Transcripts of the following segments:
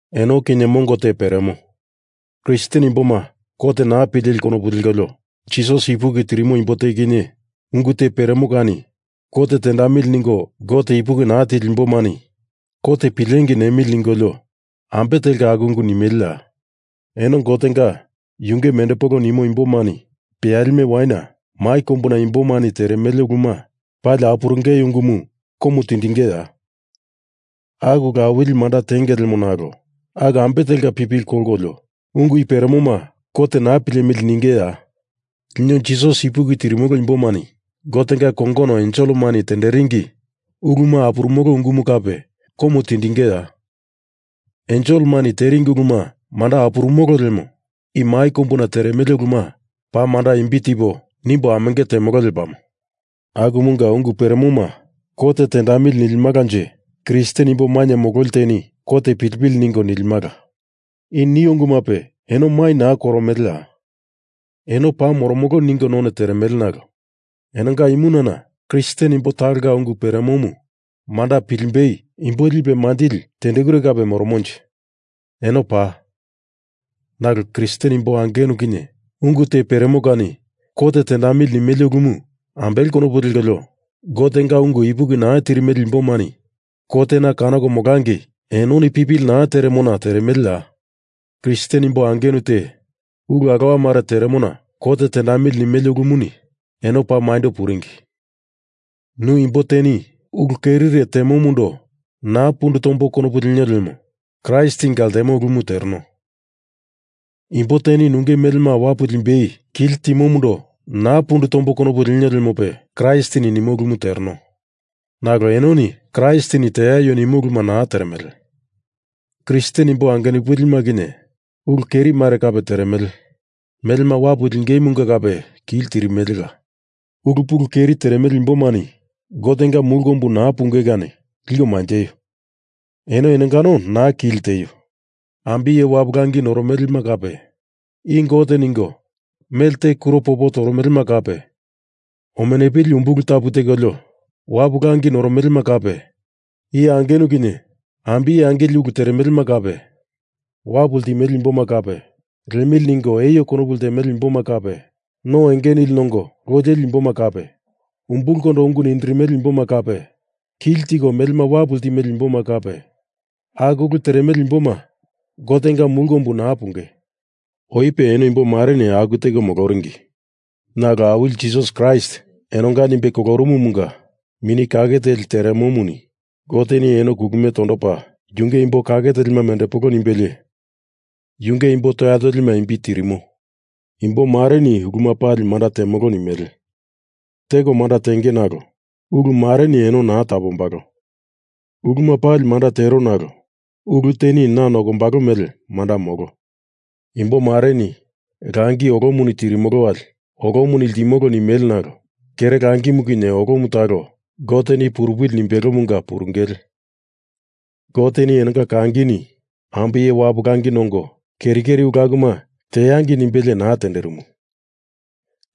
Eno kinye mongo te peremo. Kristen imboma kot naa pileli konopu lekolio Jisas ipuki tirimo imbo te kinye ungu te peremo kani kot tendamili ningo Gote ipuki naa tili imbomani kot pilengei nemili ningolio ambe telka aku ungu nimeleya? Eno Gotenga yunge mendepolo nimo imbomani peyalime waina mai kombu imbomani teremele uluma pali apurungei ungumu komu tindingeya? Aku ulu awili manda tenge lemo nalo aku ambe telka pipili kolkolio ungu i peremoma kot naa pilemili ningeya? Lino Jisas ipuki tirimolo imbomani Gotenga kongono enselemani tenderingi uluma apurumolo ungumu kape komu tindingeya? Enselemani teringi uluma manda apurumolo lemo i mai kombuna teremele uluma paa manda imbi tipo nimbo amenge temolo lepamo. Akumunga ungu peremoma kot tendamili nilimalanje Kristen imbi mainye mololi teni kot pilipili ningo lilimala. I nio ungumupe eno mai naa koromeleya? Eno paa moromolo ningo none teremele nalo enonga imunana Kristen imbo talonga ungu peremomu manda pilimbei imbo lipe manjili tendekure kape moromonje? Eno paa. Nalo Kristen imbo angenu kinye ungu te peremo kani kot tendamili nimele ulumu ambele konopu lekolio Gotenga ungu ipuki naa tirimele imbomani kotena kanoko molangei enoni pipili naa teremona teremeleya? Kristen imbo angenu te ulu alowa mare teremona kot tendamili nimele ulumuni eno paa maindo puringi. Nu imbo teni ulu kerire temomundo naa pundu tombo konopu lenio lemo Kraistinga ltemo ulumu tereno. Imbo teni nunge melema wapu limbei kili timomundo naa pundu tombo konopu lenio lemope Kraistini nimo ulumu tereno. Nalo enoni Kraistini teaio nimo uluma naa teremele. Kristen imbo angenupilima kinye ulu keri mare kape teremele. Melema wapu lingeimunga kape kili tirimelela. Ulu pulu keri teremele imbomani Gotenga mulu kombu naa punge kani liko manjeio. Eno enongano naa kili tieio. Ambiye wapu langi noromelema kape i Gote ningo mele te kuro popo toromelema kape omenupili umbulu tapu tekolio wapu langi noromelema kape iye angenu kinye ambiye angili ulu teremelema kape wapu ltimele imboma kape liemili ningo eio konopu ltemele imboma kape no enge nili nongo loi leli imboma kape umbulkondo ungu nindirimele imboma kape kili tiko melema wapu ltimele imboma kape aku ulu teremele imboma Gotenga mulu kombu naa punge. Oipe eno imbomareni aku teko moloringi. Nalo Awili Jisas Kraist enonga nimbe kolorumumunga Mini Kake Teli teremomuni Goteni eno kulumie tondopa yunge imbo kake telima mendepolo nimbelie yunge imbo toya tolima imbi tirimo. Imbomareni uluma pali manda temolo nimele. Teko manda tenge nalo ulu mareni eno naa tapombalo. Uluma pali manda tero nalo ulu teni na nokombalo mele manda molo. Imbomareni langi olomuni tirimolo wali olomuni ltimo nimele nalo kere langimu kinye olomu talo Goteni purupili nimbelomunga purungele. Goteni enonga kangini ambiye wapu langi nongo keri keri ulu akuma teangei nimbelie naa tenderimu.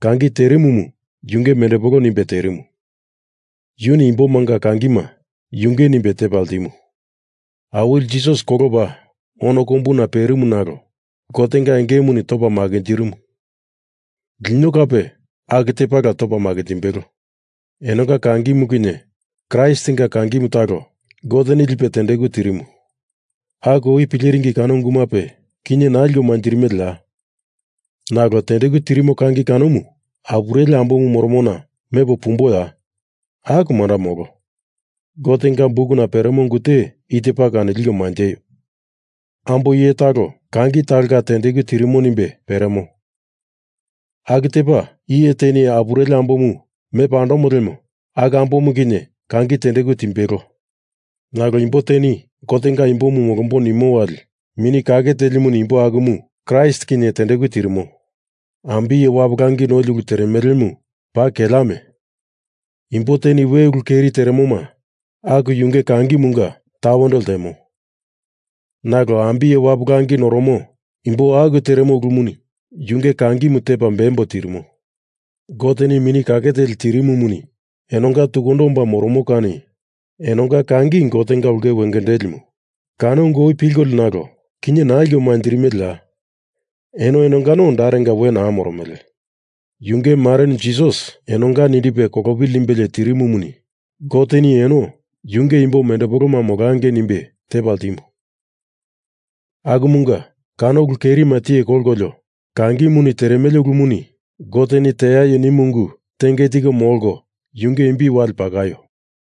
Kangi terimumu yunge mendepolo nimbe terimu. Yuni imbomanga kangima yunge nimbe tepa ltimu. Awili Jisas kolopa ono kombuna perimu nalo Gotenga engemuni topa makinjirimu. Lino kape aku tepala topa makinjimbelo. Enonga kangimu kinye Kraistinga kangimu talo Goteni lipe tendeku tirimu. Aku oi pileringi kano ungumape kinye naa liko manjirimeleya? Nalo tendeku tirimo kangi kanomu apureli ambomu moromona mepo pumboya? Aku manda molo! Gotenga bukuna peremo ungu te i tepa kani liko manjeio! Ambo iye talo kangi talonga tendeku tirimo nimbe peremo. Aku tepa, iye teni apureli ambomu mepa andomo lemo aku ambomu kinye kangi tendeku timbelo. Nalo imbo teni Gotenga imbomu molombo nimo wali Mini Kake Telimuni imbo akumu Kraist kinye tendeku tirimo. Ambiye wapu langi noli ulu teremelemu paa keleame! Imbo teni we ulu keri teremoma aku yunge kangimunga tawendo ltemo. Nalo ambiye wapu langi noromo imbo aku teremo ulumuni yunge kangimu tepa beambo tirimo. Goteni Mini Kake Teli tirimumuni enonga tukundo omba moromo kani enonga kangi Gotenga ulke wengendelimu kano ungumu oi pilkolio nalo kinye naa liko manjirimeleya? Eno enongano darenga we naa moromele. Yunge marenu Jisas enonga nindipe kolopili nimbelie tirimumuni Goteni eno yunge imbo mendepoloma molangei nimbe tepa ltimu. Akumunga kano ulu kerima tiye kolkolio kangimuni teremele ulumuni Goteni teaio nimu ungu tenge tiko molko yunge imbi wale pakaio.